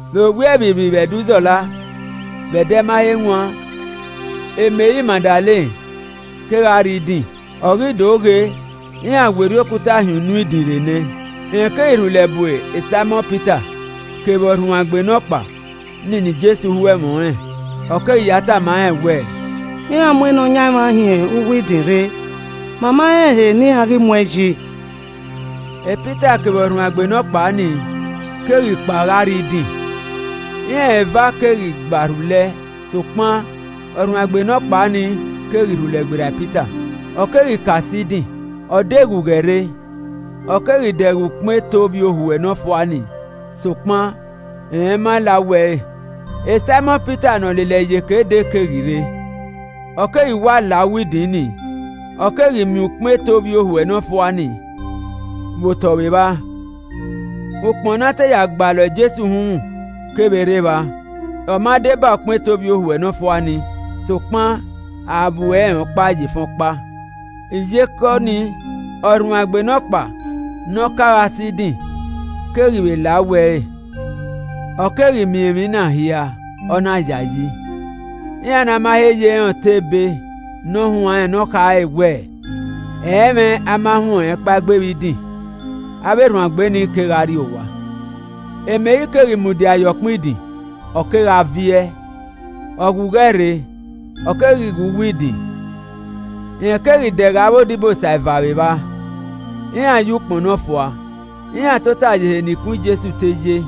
Vbe owiẹ vbirrivbirri vbe Ẹdẹ Uzọla, vbe ẹdẹ ma he wan, Meri Magdalen kegha rrie idin, ọ ghi do ghe iran werriẹ okuta hin unu idin rre nẹ. Rẹn keghi rhulẹ bu Saimọn Pita kevbe ọrhuanegbe nọkpa nii ne Jesu ho ẹmwẹ ọnrẹn, ọ keghi ya tama rẹn wẹẹ, “Iran mu Nọyaẹnmwa hin uwu idin rre, ma ma rẹn ehe ne iran ghi muẹn yi.” Pita kevbe ọrhuanegbe nọkpa nii keghi kpao gha rrie idin. Iran eva keghi gba rhulẹ sokpan ọrhuanegbe nọkpa nii keghi rhulẹ gberra Pita, ọ keghi ka sẹ idin. Ọ de ghughẹ rre, ọ keghi dẹghe ukpọn eto ovbiohuẹ nọfua nii, sokpan rẹn ma la uwu ẹre. Saimọn Pita ne ọ lele ẹre iyeke dee keghi rre, ọ keghi wa la uwu idin ni, ọ keghi miẹn ukpọn eto ovbiohuẹ nọfua nii, vbe otọ vbe evba. Ukpọn ne a te ya gbalọ Jesu uhunmwu kevbe rre evba, ọ ma deba ukpọn eto ovbiohuẹ nọfua nii, sokpan a vbuẹ rẹn ọkpa ye efẹn ọkpa. Iyeke ọnii ọrhuanegbe nọkpa ne ọ ka gha sẹ idin keghi vbe la uwu ẹre, ọ keghi miẹn emwi na hia, ọ na yayi. (Iran ma he ye rẹn otọ ebe ne ọ huanrẹn ne ọ khare wẹ ẹ i mwẹ a ma huẹn ọnrẹn kpaegbe vbe idin.) Avbe erhuanegbe ni kegha rrie owa. Meri keghi mudia ye ọkpẹn idin, ọ kegha viẹ, ọ ghughẹ rre, ọ keghi ghe uwu idin. Rẹn keghi dẹghe avbe odibosa eva vbe evba, iran yọ ukpọn nọfua, iran tota ye ehe ne ikun Jesu te ye,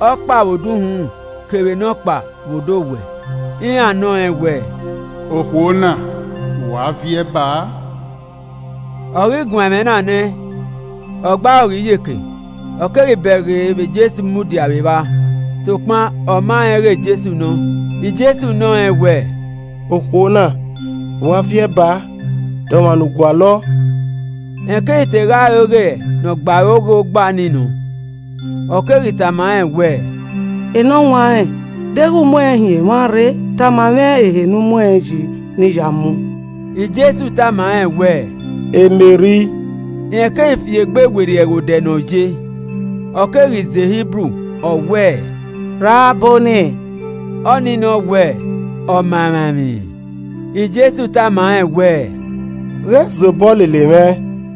ọkpa vbe odẹ uhunmwu kevbe nọkpa vbe odẹ owẹ. Iran nọ rẹn wẹẹ, “Okhuo na, vbe u a viẹ baa?” Ọ ghi guan ẹmwẹ na nẹ, ọ gbe aro ghe iyeke, ọ keghi bẹghe vbe Jesu mudia vbe evba, sokpan ọ ma rẹn ighẹ Jesu nọ. Jesu nọ rẹn wẹẹ, “Okhuo na vbe u a viẹ baa? De ọmwa ne u gualọ?” Rẹn keghi te gha ro ighẹ ne ọ gbe aro ghe ogba nii nọ, ọ keghi tama rẹn wẹẹ, “Enọwanrẹn, deghẹ u muẹn hin emwa rre, tama mwẹ ehe ne u mu ẹn yi ne I ya mu.” Jesu tama rẹn wẹ, “Meri!” Rẹn keghi fi egbe werriẹ ghe odẹ ne ọ ye, ọ keghi zẹ Hibru ọ wẹẹ, “Rabbọni!” (ọnii nọ wẹ “Ọmamwaemwi.”) Jesu tama rẹn wẹẹ, “Ghẹ zobọ lele mwẹ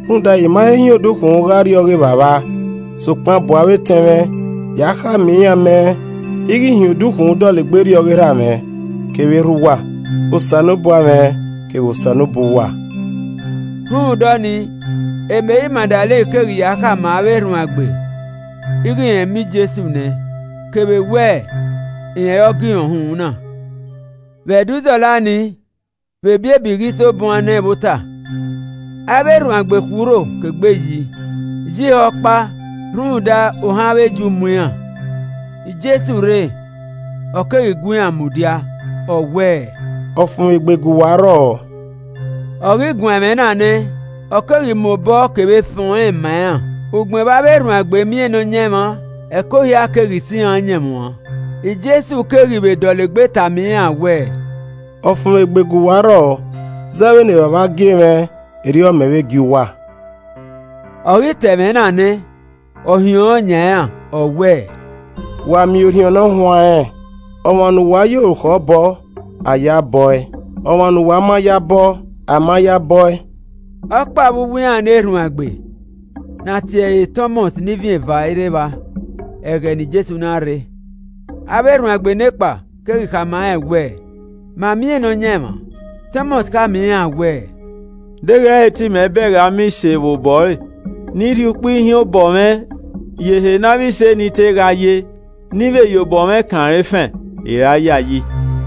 rhunmwuda I ma he hin odukhunmwu gha rrie ọghe Evbavba, sokpan bu avbe etẹn mwẹ, ya khama iran mẹ ighẹ ‘I hin odukhunmwu dọlegbe rrie ọghe Erha mwẹ, kevbe Erha uwa, Osanobua mwẹ, kevbe Osanobua uwa.’” Rhunmwuda ọnii, Meri Magdalen keghi ya khama avbe erhuanegbe ighẹ rẹn miẹn Jesu nẹ, kevbe wẹ rẹn ọre ọ gie irẹn uhunmwu na. Vbe Ẹdẹ Uzọla nii, vbe ebiebi ghi so buan nẹ vbe ota, avbe erhuanegbe khui urho ke egbe yi ye ihọkpa rhunmwuda ohan avbe Ju mu iran. Jesu rre, ọ keghi gu iran mudia, ọ wẹẹ, “Ọfumwegbe gu uwa rrọọ.” Ọ ghi guan ẹmwẹ na nẹ, ọ keghi mu obọ kevbe efẹn ọnrẹn ma iran. Ugbẹn vbe avbe erhuanegbe miẹn Nọyaẹnmwa, ẹko hia keghi sẹ iran ọyẹnmwẹ uan. Jesu keghi vbe dọlegbe tama iran wẹẹ, “Ọfumwegbe gu uwa rrọọ. zẹ vbene Evbavba gie mwẹ, erriọ mẹ vbe gie uwa.” Ọ ghi ta ẹmwẹ na nẹ, ọ hiọnrọn yan iran ọ wẹ, “Wa miẹn Orhiọn Ne Ọ Huanrẹn. Ọmwa ne uwa ya orukhọ bọ, a ya ẹe bọ ẹe, ọmwa ne uwa ma ya bọ, a ma ya ẹe bọ ẹe.” Ọkpa vbe uwu iran ne erhuanegbe, ne a tie ẹre Tọmọs (ne Ivin eva) i rre evba ẹghẹ ne Jesu na rre. Avbe erhuanegbe nekpa keghi khama rẹn wẹẹ, “Ma miẹn Nọyaẹnmwa.” Tọmọs khama iran wẹẹ, “Deghẹ ẹ i re te imẹ bẹghe ama ise vbe obọ ẹre, ne I rhie ukpẹ ihiẹn obọ mwẹ ye ehe ne avbe ise nii te gha ye, ne I vbe ya obọ mwẹ kan rẹn efẹn, I i ra yayi.”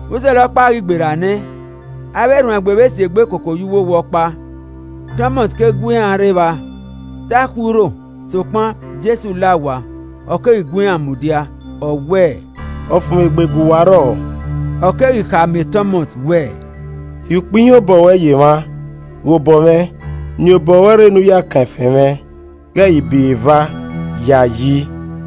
Uzọla ọkpa ghi gberra nẹ, avbe erhuanegbe vbe si egbe koko ye uwowa ọkpa, Tọmọs keghi gu iran rre evba. Te a khui urho, sokpan Jesu la owa, ọ keghi gu iran mudia, ọ wẹẹ, “Ọfumwegbe gu uwa rrọọ.” Ọ keghi khama Tọmọs wẹẹ, “Rhie ukpẹ ihiẹn obọ ruẹ ye emwa, ghe obọ mwẹ, niẹn obọ ruẹ rre ne u ya ẹe kan efẹn mwẹ. Ghẹ i ghi bọ iro eva, yayi!”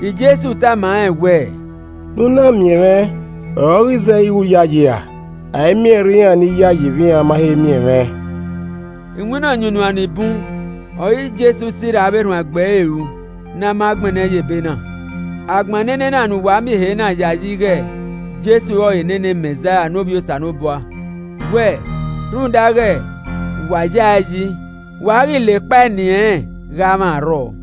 Jesu tama rẹn wẹẹ, “Ne u na miẹn mwẹ ọre ọ ghi zẹ ighẹ u yayi ra? a i miẹn ẹrrẹe iran ni yayi vbe iran ma he miẹn mwẹ!” Iwinna ọyunnuan ni bun ọre Jesu sirra avbe erhuanegbe ẹre ru ne a ma gbẹnnẹ ye ebe na. A gbẹnnẹ enena ne uwa miẹn ehe na yayi ighẹ Jesu ọrọre nene Mẹzaia ne Ovbi Osanobua, wẹ, rhunmwuda ighẹ wa ya ẹe yi, wa ghi la ekpa eni ẹnrẹn gha mwẹ arrọọ.